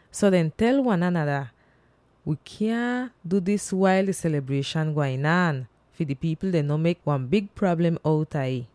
So dehn tel wan anada, “Wi kyaahn du dis wail di selibrieshan gwain aan, fi di pipl dem no mek wan big prablem outa ih.”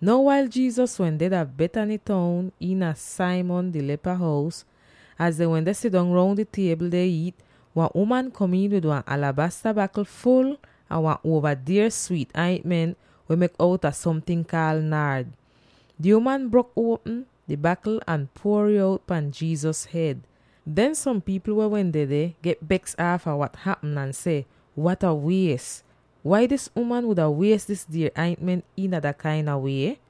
Now wail Jesus wehn deh dah Bethany toun iina Simon di Lepa hous, az dehn wende sidong roun di tiebl deh iit, wan uman kom iin wid wan alabasta bakl ful a wan uova dier swiit aintment weh mek outa somting kaal “naard.” Di uman brok uopm di bakl ahn puor'ih out pan Jesus hed. Den som pipl weh wehn dedeh, get beks aafa wat hapm, ahn seh, “Wat a wies! Wai dis uman wuda wies dis dier aintment iina dat kain a wie?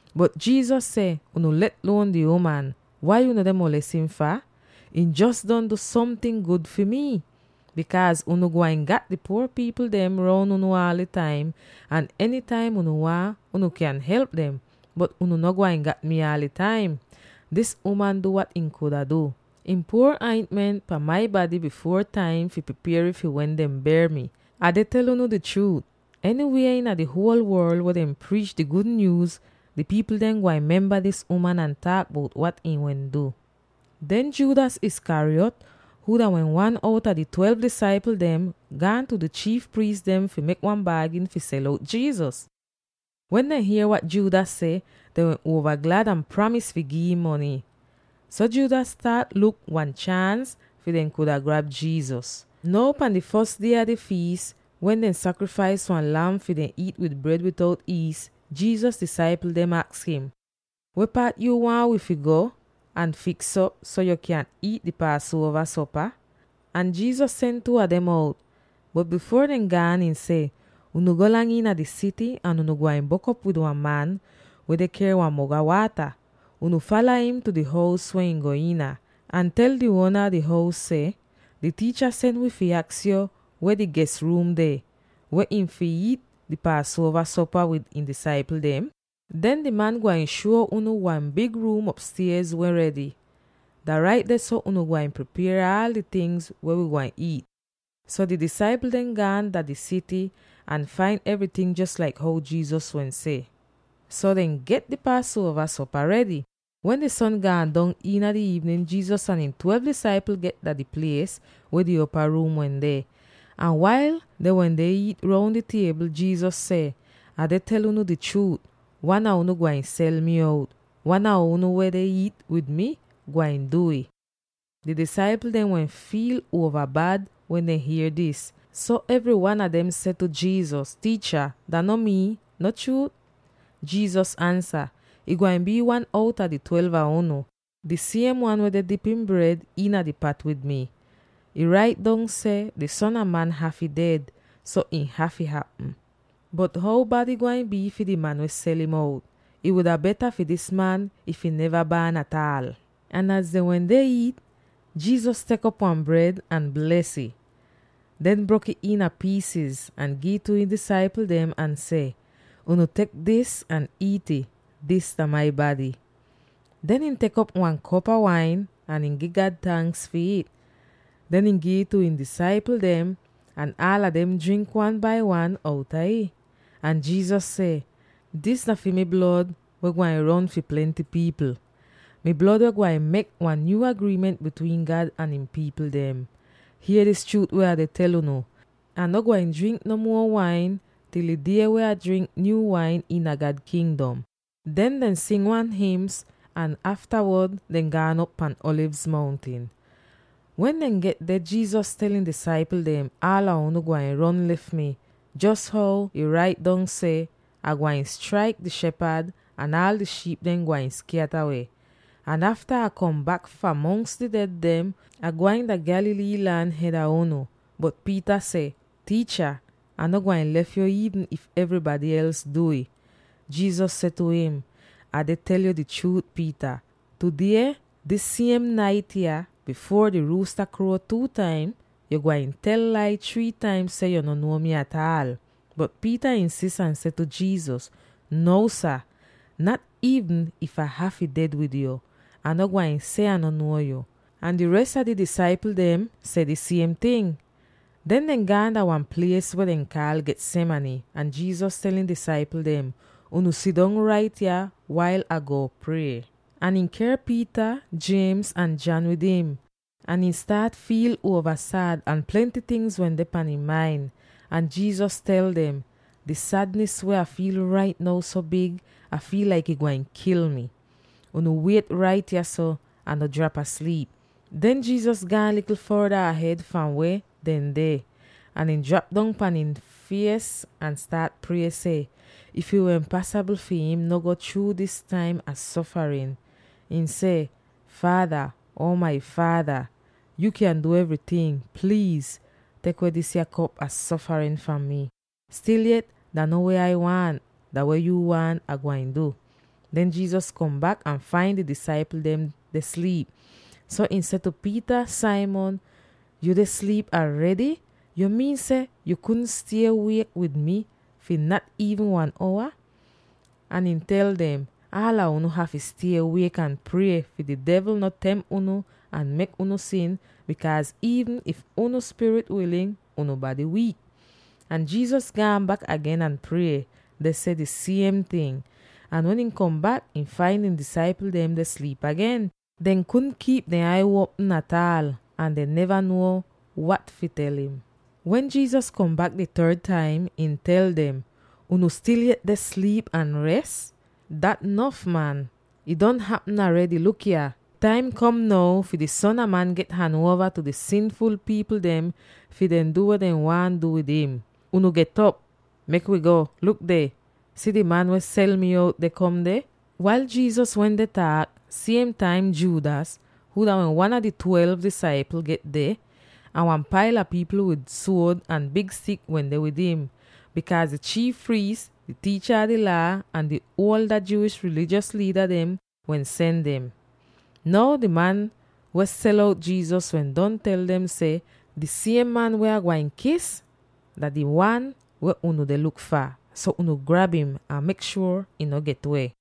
Bot Jesus seh, “Unu let luon di uman! Wai unu deh moles im fah? Ihn jos don du somting gud fi mii. Bikaaz unu gwain gat di puor pipl dem roun unu aal di taim, ahn enytaim unu waahn, unu kyan help dem. Bot unu no gwain gat mii aal di taim. Dis uman du wat ihn kuda du. Ihn puor aintment pan mai bady bifuor taim fi pripier ih fi wen dehn ber mi. Ah deh tel unu di chruut: enywie iina di huol worl weh dehn priich di gud nyuuz, di pipl dem gwain memba dis uman ahn taak bout wat ihn wehn du.” Den Judas Iscariot —huu dah wehn wan outa di twelve disaipl dem— gaan tu di chiif priis dem fi mek wan baagin fi sel out Jesus. Wen dehn hier wat Judas seh, dehn wehn uova glad ahn pramis fi gi'im mony. So Judas staat luk wan chaans fi dehn kuda grab Jesus. Now pan di fos die a di fiis wen dehn sakrifais wan lam fi dehn iit wid bred bitout iis, Jesus disaipl dem aks im, “Weh paat yu waahn wi fi go ahn fiks'op, so yo kyan iit di Paasuova sopa?” Ahn Jesus sen two a dem out. Bot bifuor dem gaan, ihn seh, “Unu golang iina di sity, ahn unu gwain bok'op wid wan man weh deh ker wan mog a waata. Unu fala im tu di hous weh ihn go iina, ahn tel di uona a di hous seh, ‘Di Tiicha sen wi fi aks yo weh di ges ruum deh, weh ihn fi iit di Paasuova sopa wid ihn disaipl dem?’ Den di man gwain shuo unu wan big ruum opstiez weh redy. Dah rait dehso unu gwain pripier aal di tingz weh wi gwain iit.” So di disaipl dem gaan dah di sity ahn fain evryting jos laik how Jesus wehn seh. So dehn get di Paasuova sopa redy. Wen di son gaan dong iina di iivnin, Jesus ahn ihn twelve disaipl get dah di plies weh di opa-ruum wehn deh. Ahn wail dehn wende iit roun di tiebl, Jesus seh, “Ah deh tel unu di chruut: Wan a unu gwain sel mi out; wan a unu weh deh iit wid mi gwain du'ih.” Di disaipl dem wehn fiil uova bad wen dehn hier dis, so evry wan a dem seh tu Jesus, “Tiicha, dah no mii, no chruut?” Jesus ansa, “Ih gwain bii wan outa di twelve a unu, di siem wan weh deh dip ihn bred iina di pat wid mi. Ih rait dong seh di Son a Man hafy ded, so ih hafy hapm. Bot how bad ih gwain bii fi di man weh sel'im out. Ih wuda beta fi dis man, if ihn neva baan ataal!” Ahn az dehn wende iit, Jesus tek op wan bred, ahn bles ih. Den brok'ih iina piisiz, ahn giv it tu ihn disaipl dem ahn seh, “Unu tek dis ahn iit'it. Dis dah mi bady.” Den ihn tek op wan kop a wain ahn gi God tanks fi ih. Den ihn giv it tu ihn disaipl dem, ahn aala dem drink wan bai wan outa ih. Ahn Jesus seh, “Dis dah mi blod weh gwain ron fi plenty pipl; mi blod weh gwain mek wan nyuu agriiment bitwiin God ahn ihn pipl dem. Hier dis chruut weh Ah deh tel unu: Ah no gwain drink no muo wain til di die wen Ah drink nyuu wain iina God Kingdom.” Den dehn sing wan hims, ahn aftawod dehn gaan op pan Alivz Mountin. Wen dehn get deh, Jesus tel ihn disaipl dem, “Aala unu gwain ron lef mi, jos how ih rait dong seh, ‘Ah gwain straik di shepad, ahn aal di shiip dem gwain skyata weh.’ Ahn afta Ah kom bak fahn mongs di ded dem, Ah gwain dah Galilee lan hed a unu.” Bot Peter seh, “Tiicha, Ah no gwain lef yo iivn if evrybady els du'ih!” Jesus seh tu im, “Ah deh tel yo di chruut, Peter: Tudeh, dis siem nait yah, bifuor di ruusta kruo two taim, yu gwain tel lai three taim seh yu no nuo mi ataal.” Bot Peter insis ahn seh tu Jesus, “Nuo sah, nat iivn if Ah hafy ded wid yo, Ah no gwain seh Ah no nuo yo!” Ahn di res a di disaipl dem seh di siem ting. Den dehn gaan dah wan plies weh dehn kaal Gethsemane ahn Jesus tel ihn disaipl dem, “Unu sidong rait yah, wail Ah go prie.” Ahn ihn ker Peter, James ahn John wid im, ahn ihn staat fiil uova sad, ahn plenty tingz wende iina ihn main. Ahn Jesus tel dem, “Di sadnis weh Ah fiil rait now so big Ah fiil laik ih gwain kil mi. Unu wiet rait yahso, ahn no drap asliip.” Den Jesus gaan likl forda ahed fahn weh dehn deh, ahn ihn drap dong pahn ihn fies ahn staat prie seh, if ih wehn pasabl fi im no go chruu dis taim a sofarin. Ihn seh, “Faada, Uo mai Faada! Yu kyan du evryting; pliiz tek weh disya kop a sofarin fahn mi. Stil yet, dah no weh Ai waahn; dah weh yuu waahn Ah gwain du.” Den Jesus kom bak ahn fain di disaipl dem deh sliip, so ihn seh tu Peter, “Simon, yu deh sliip aredy? Yu miin seh yu kudn stie wiek wid mi fi nat iivn wan owa?” Ahn ihn tel dem, “Aala unu hafy stie wiek ahn prie fi di devl no temp unu ahn mek unu sin, bikaaz iivn if unu spirit wilin, unu bady wiik.” Ahn Jesus gaan bak agen ahn prie, deh seh di siem ting. Ahn wen ihn kom bak, ihn fain ihn disaipl dem deh sliip agen; dehn kudn kiip dehn ai uopm ataal, ahn dehn neva nuo wat fi tel im. Wen Jesus kom bak di third taim, ihn tel dem, “Unu stil yet deh sliip ahn res? Dat nof man; ih don hapm aredy. Luk yah! Di taim kom now fi di Son a Man get han uova tu di sinful pipl dem fi dehn du weh dehn waahn du wid im. Unu get'op; mek wi go! Luk deh; si di man weh sel mi out, deh kom deh.” Wail Jesus wende taak, siem taim Judas —huu dah wehn wan a di twelve disaipl— get deh. Ahn wan paila pipl wid suod ahn big stik wende wid im, bikaaz di chiif priis, di tiicha a di Laa, ahn di ada Jewish rilijos liida dehn wehn sen dem. Now, di man weh sel out Jesus wehn don tel dem seh, “Di siem man weh Ah gwain kis dah di wan weh unu deh luk fah, so unu grab im, ahn mek shuor im no get-weh.”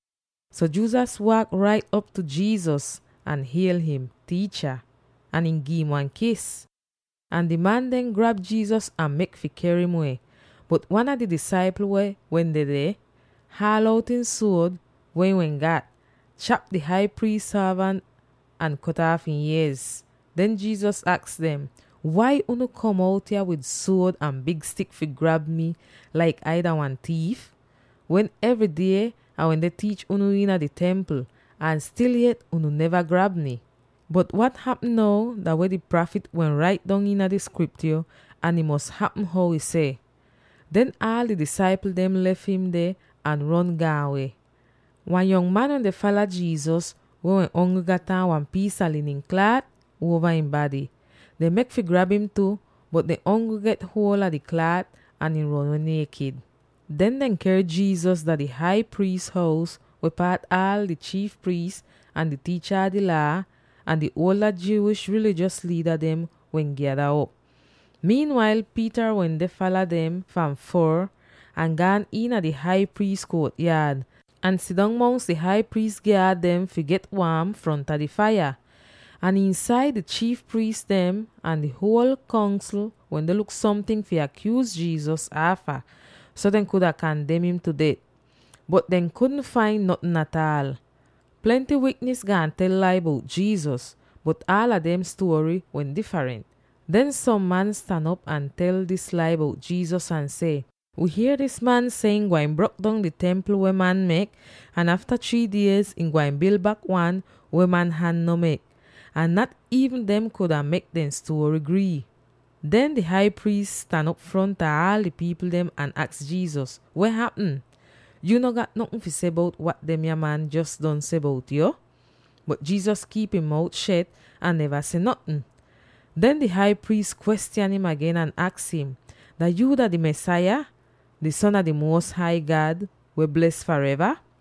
So Judas waak rait op tu Jesus ahn hiel im, “Tiicha!” ahn ihn gi'im wan kis. Ahn di man dem grab Jesus ahn mek fi ker im weh. Bot wan a di disaipl weh wehn dedeh, haal out ihn suod, weh ihn wehn gat, chap di Hai Priis sorvant ahn kot aaf ihn iez. Den Jesus aks dem, “Wai unu kom out yah wid suod ahn big stik fi grab mi laik Ai dah wan tiif, wen evry die Ah wende tiich unu iina di Templ, ahn stil yet unu neva grab mi? Bot wat hapm now dah weh di prafit wehn rait dong iina di Skriptyo ahn ih mos hapm how ih seh.” Den aal di disaipl dem lef im deh ahn ron gaan weh. Wan yong man wende fala Jesus, weh wehn ongl gat aan wan piis a linin klaat uova ihn bady. Dehn mek fi grab im tu, bot dehn ongl get huol a di klaat, ahn ihn ron weh niekit. Den dehn ker Jesus dah di Hai Priis hous weh paat aala di chiif priis, ahn di tiicha a di Laa, ahn di ada Jewish rilijos liida dem wehn gyada op. Wail dah taim kom, Peter wende fala dem fahn foor ahn gaan iina di Hai Priis kuot-yaad, ahn sidong mongs di Hai Priis gyaad dem, fi get waam fronta di faiya. Ahn iinsaid, di chiif priis dem ahn di huol Kongsl wende luk somting fi akyuuz Jesus aafa, so dehn kuda kandem im tu det. Bot dehn kudn fain notn ataal. Plenty wiknis gaan tel lai bout Jesus, bot aala dem stuory wehn difrent. Den som man stan op ahn tel dis lai bout Jesus, ahn seh, “Wi hier dis man seh ihn gwain brok dong di Templ weh man mek, ahn afta three diez, ihn gwain bil bak wan weh man han no mek!” Ahn nat iivn dem kuda mek dehn stuory grii. Den di Hai Priis stan op fronta aal di pipl dem ahn aks Jesus, “Weh hapm? Yu no gat notn fi seh bout wat demya man jos don seh bout yo?” Bot Jesus kiip ihn mout shet ahn neva seh notn. Den di Hai Priis kwestyan im agen ahn aks im, “Dah yuu dah di Mesaya, di Son a di Muos Hai God weh bles fareva?”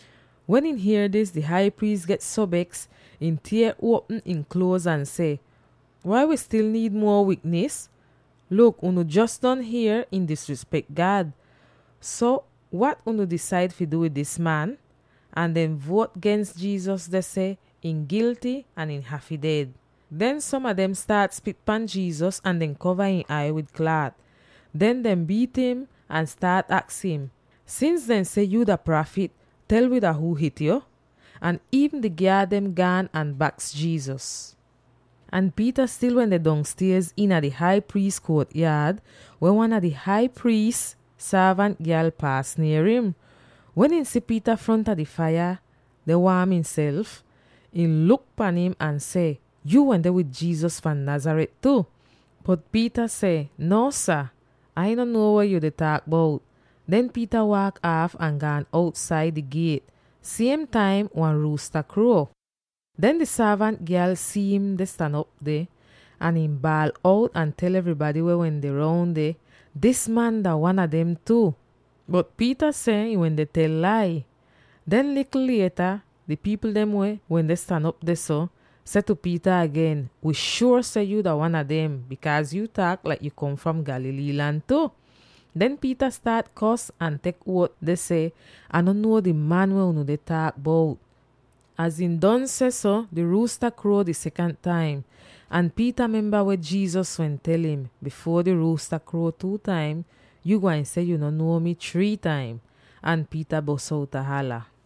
Wen ihn hier dis, di Hai Priis get so beks ihn tier uopm ihn kluoz ahn seh, “Wai wi stil niid muo wiknis? Luk unu jos don hier im disrispek God! So, wat unu disaid fi du wid dis man?” Ahn dehn vuot gens Jesus deh seh ihn gilty ahn ihn hafy ded. Den som a dem staat spit pan Jesus, ahn dehn kova ihn ai wid klaat. Den dehn biit im, ahn staat aks im, “Sins dehn seh yuu dah prafit, tel wi dah huu hit yo?” Ahn iivn di gyaad dem gaan ahn baks Jesus. Ahn Peter stil wende dong stiez iina di Hai Priis kuot-yaad, wen wan a di Hai Priis sorvant gyal paas nier im. Wen ihn si Peter fronta di faiya deh waam imself, ihn luk pan im ahn seh, “Yuu wende wid Jesus fahn Nazareth tu!” Bot Peter seh, “Nuo sah! Ah no nuo dah weh yu deh taak bout.” Den Peter waak aaf ahn gaan outsaida di giet. Siem taim wan ruusta kruo. Den di sorvant gyal si'im deh stan op deh, ahn ihn baal out ahn tel evrybady weh wende roun deh, “Dis man dah wan a dem tu!” Bot Peter seh ihn wende tel lai. Den, likl lieta di pipl dem weh wende stan op dehso, seh tu Peter agen, “Wi shuor seh yo dah wan a dem, bikaaz yu taak laik yu kom fahn Galilee lan tu!” Den Peter staat kos ahn tek uot deh seh, “Ah no nuo di man weh unu deh taak bout!” Az ihn don sehso, di ruusta kruo di sekant taim. Ahn Peter memba weh Jesus wehn tel im, “Bifuor di ruusta kruo two taim, yu gwain seh yu no nuo mi three taim.” Ahn Peter bos outa hala.